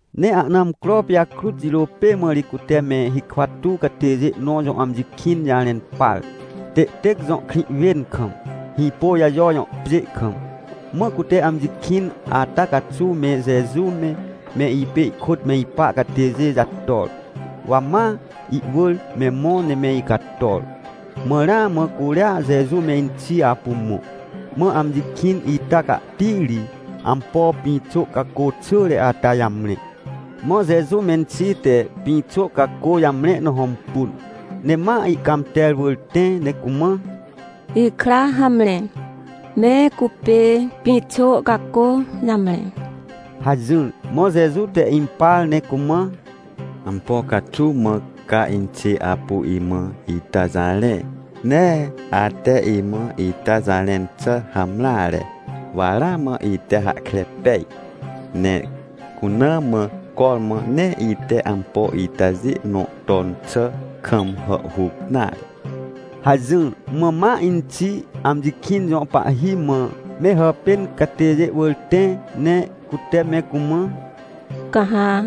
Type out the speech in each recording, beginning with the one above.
Ne ahna amcro pijakrut jirô pê mã ri cute me hikwa tuw catêjê nõ jõ amji kĩn jarẽn par, Têtêc jõ krĩ wên kam, Hĩpôjajo jõ pjê kam. Mã cute amji kĩn ata caxuw me Jeju me, me ipê ihkôt me ipa catêjê jator. Wa ma ihwỳr me mõ ne me icator. Mã ramã curia Jeju menxi apu mõ. Mã amji kĩn ita cahti ri ampo pĩxô cacô xỳre ata jamre. Mã Jeju menxi te pĩxô cacô jamre na hõmpun, ne ma ihcãmter wỳr tẽ ne cumã: — Ikra, hamre, me cupê pĩxô cacô jamre — hajỹr. Mã Jeju te impar ne cumã: — Ampo caxuw mã ca inxê apu imã ita jarẽ? Nee ate imã ita jarẽn xà hamreare, wa ramã ite hahkre pej. Ne cuna mã cormã nee ite ampo itajê nõ ton xà kam hàhhuc nare — hajỹr. Mã ma inxi amji kĩn jõ pahhi mã me hàpên catêjê wỳr tẽ, ne cute me cumã: — Ca ha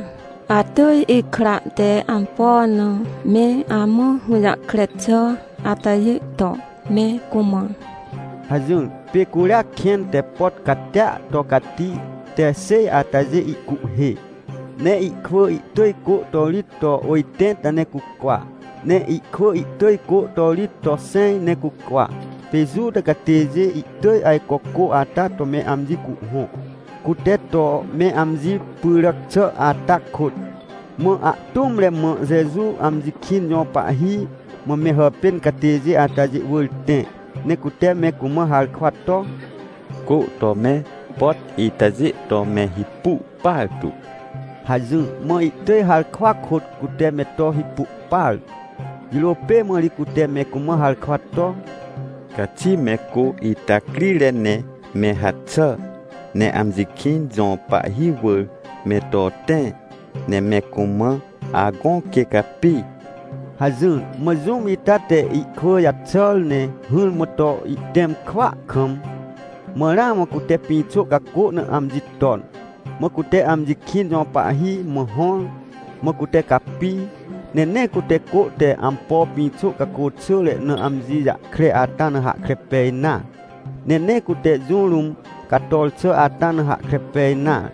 atỳj ikra te ampo na me amã hũjahkre xà atajê to me cumã — hajỹr. Pê curia kẽn te pot catia to cati te xêj atajê ihcuhhê. Ne ihkwỳ ihtỳj cô to rit to ôjtẽnta ne cucwa, ne ihkwỳ ihtỳj cô to rit to xẽj ne cucwa. Pê Juta catêjê ihtỳj ajco cô ata to me amji cuhhõ, cute to me amji pyràc xà ata kôt. Mã ahtũmre mã, Jeju amji kĩn jõ pahhi mã me hàpên catêjê atajê wỳr tẽ, ne cute me cumã harkwa to: — Cô to me pot itajê to me hipu partu — hajỹr. Mã ihtỳj harkwa kôt cute me to hipu partu. Jirô pê mã ri cute me cumã harkwa to: — Caxi me cô ita crire ne me haxà, ne amji kĩn jõ pahhi wỳr me to tẽ, ne me cumã agõ, quê capi — hajỹr. Mã jũm ita te ihkwỳ jaxàr, ne hỹrmã to ihtẽm kwỳa kam, mã ramã cute pĩxô cacô na amji ton. Mã cute amji kĩn jõ pahhi mã hõr, mã cute capi, ne nee cute cô te ampo pĩxô cacô xỳre na amji jahkre ata na hahkre pej nare. Ne nee cute jũ rũm cator xà ata na hahkre pej nare.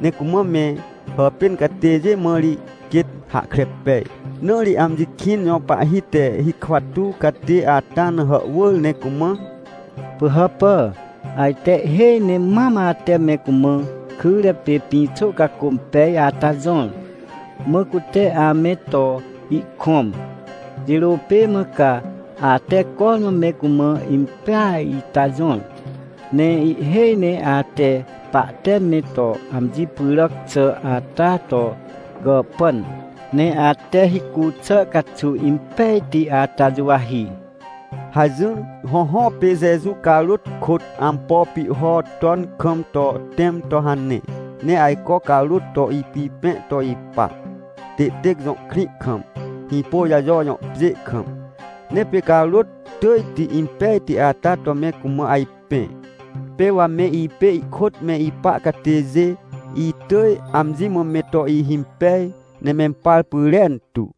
Ne cumã me hàpên catêjê mã ri quêt hahkre pej. Na ri amji kĩn jõ pahhi te hikwa tuw catê ata na hàhwỳr ne cumã: — Pỳhàpà, ajte ihhêj ne mam ate me cumã kyre pê pĩxô cacô impej ata jõr, mã cute ame to ihkõm. Jirô pê mã ca ate cormã me cumã impeaj ita jõr. Ne ihhêj ne ate pahte me to amji pyràc xà ata to gàhpan, ne ate hicu xà caxuw impejti ata juwahi — hajỹr. Hõhõ, pê Jeju carôt kôt ampo pihho ton kam to tẽm to hane, ne ajco carôt to ipipẽ to ipa, Têtêc jõ krĩ kam, Hĩpôjajo jõ pjê kam. Ne pê carôt tỳjti impejti ata to me cumã ajpẽ. Pê wa me ipê ihkôt me ipa catêjê, itỳj amji mã me to ihimpej, ne mempar pyrentu.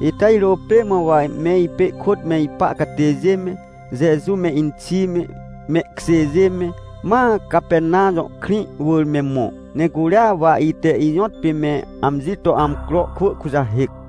Ita jirô pê mã wa me ipê ihkôt me ipa catêjê me, Jeju me, inxi me, mehkjêjê me, ma Capernam jõ krĩ wỳr me mõ, ne curia wa ite ijõtpê me amji to amcro kwỳ kujahêc.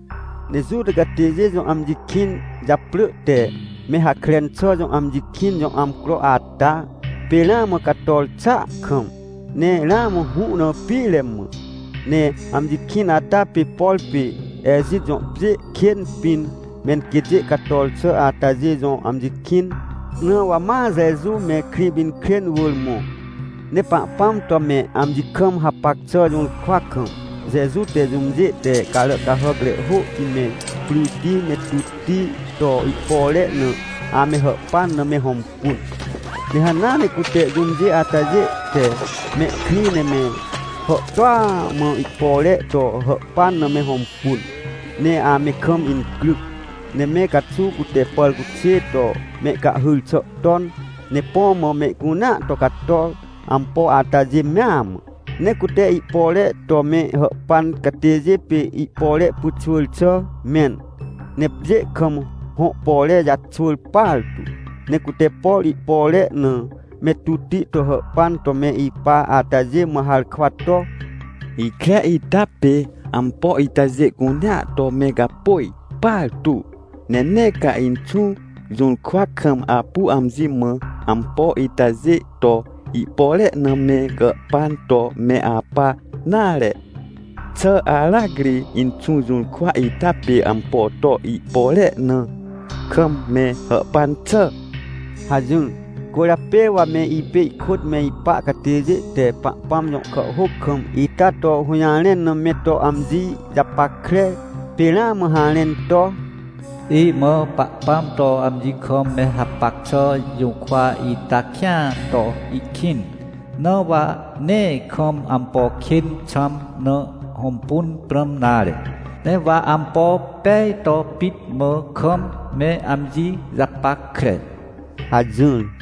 Ne Juta catêjê jõ amji kĩn japrỳ te, me Hakren xà jõ amji kĩn jõ amcro ata, pê ramã cator xàa kam, ne ramã hũ na pire mã. Ne amji kĩn ata pê, por pê Ejit jõ pjê kên pĩn, menquêtjê cator xà atajê jõ amji kĩn. Na wa ma Jeju me Krĩpinkrên wỳr mõ. Ne Pahpãm to me amji kam hapac xà jũrkwa kam, Jeju te jũmjê te carà cahàcre hôhti me, pryti me, tutti to ihpore na ame hàhpan na me hõmpun. Ne hanea ne cute jũmjê atajê te mehkrĩ ne me hàhtôa mã ihpore to hàhpan na me hõmpun. Ne ame kam incryc, ne me caxuw cute pàrcuxê to mehcahhyr xà ton, ne põ mã mehcunea to cator, ampo atajê mea mã. Ne cute ihpore to me hàhpan catêjê pê ihpore pyxwỳr xà mẽn, ne pjê kam hõ pore jaxwỳr partu. Ne cute, por ihpore na me tutti to hàhpan to me ipa atajê mã harkwa to: — Ikre ita pê ampo itajê cunea to me gapôj partu! Ne nee ca Inxũ jũrkwa kam apu amji mã ampo itajê to ihpore na me gàhpan to me apa nare. Xà aracri Inxũ jũrkwa ita pê ampo to ihpore na kam me hàhpan xà? — hajỹr. Cwỳrjapê wa me ipê ihkôt me ipa catêjê te Pahpãm jõ kàhhôc kam ita to hũjarẽn na me to amji japackre, pê ramã harẽn to: “Imã Pahpãm to amji kam me hapac xà jũrkwa ita kĩan to ihkĩn. Na wa nee kam ampo kên xãm na hõmpun prãm nare, ne wa ampo pej to pit mã kam me amji japackre” hajỹr.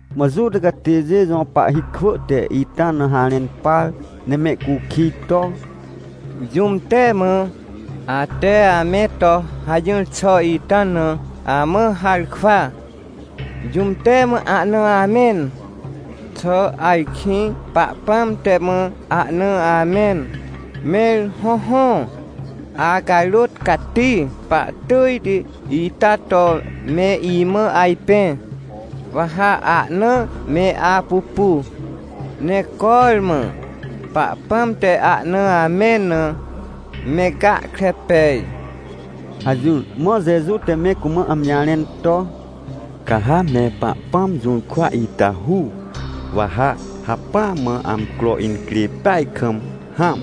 Mã Juta catêjê jõ pahhi kwỳ te ita na harẽn par ne mehcukij to: — Jũm te mã, ate ame to hajỹr xà ita na, amã harkwa? Jũm te mã ahna amẽn? Xà ajkĩ Pahpãm te mã ahna amẽn? Mẽr hõhõ, acarôt cati pahtỳjti ita to me imã ajpẽ, wa ha ahna me apupu, ne cormã Pahpãm te ahna amẽn na me gahkre pej — hajỹr. Mã Jeju te me cumã amji jarẽn to: — Ca ha me Pahpãm jũrkwa ita hu, wa ha hacpỹa mã amcro incrê peaj kam hãm,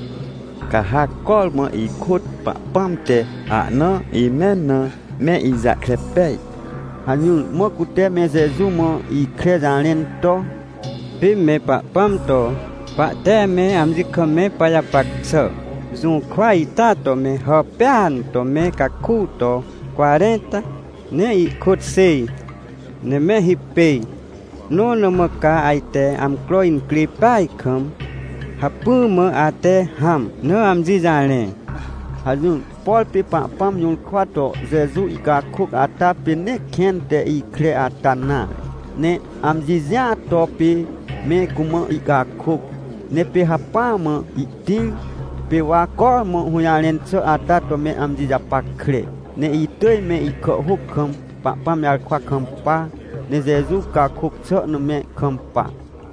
ca ha cormã ihkôt Pahpãm te ahna imẽn na me ijahkre pej — hajỹr. Mã cute me Jeju mã ikre jarẽn to: — Pê me Pahpãm to pahte me amji kam me pajapac xà jũrkwa ita to me hàpêan to me caku to cwarẽnta ne ihkôt xêj, ne me hipêj, nõ na mã ca ajte amcro incrê peaj kam hacpỹa mã ate hãm na amji jarẽ? — hajỹr. Por pê Pahpãm jũrkwa to Jeju ihcakôc ata pê nee kẽn te ikre ata nare, ne amji jĩa to pê me cumã ihcakôc. Ne pê hacpỹa mã ihtĩr, pê wa cormã hũjarẽn xà ata to me amji japackre, ne itỳj me ihkàhhôc kam Pahpãm jarkwa kampa, ne Jeju cakôc xà na me kampa.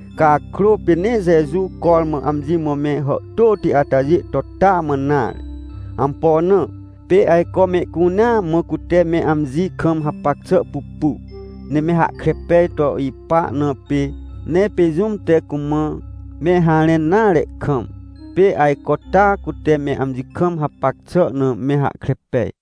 Cakrô pê nee Jeju cormã amji mã me hàhtôti atajê to taa mã nare. Ampo na? Pê ajco mehcunea mã cute me amji kam hapac xà pupu, ne me hahkre pej to ipa na pê. Ne pê jũm te cumã me harẽn nare kam, pê ajco taa cute me amji kam hapac xà na me hahkre pej.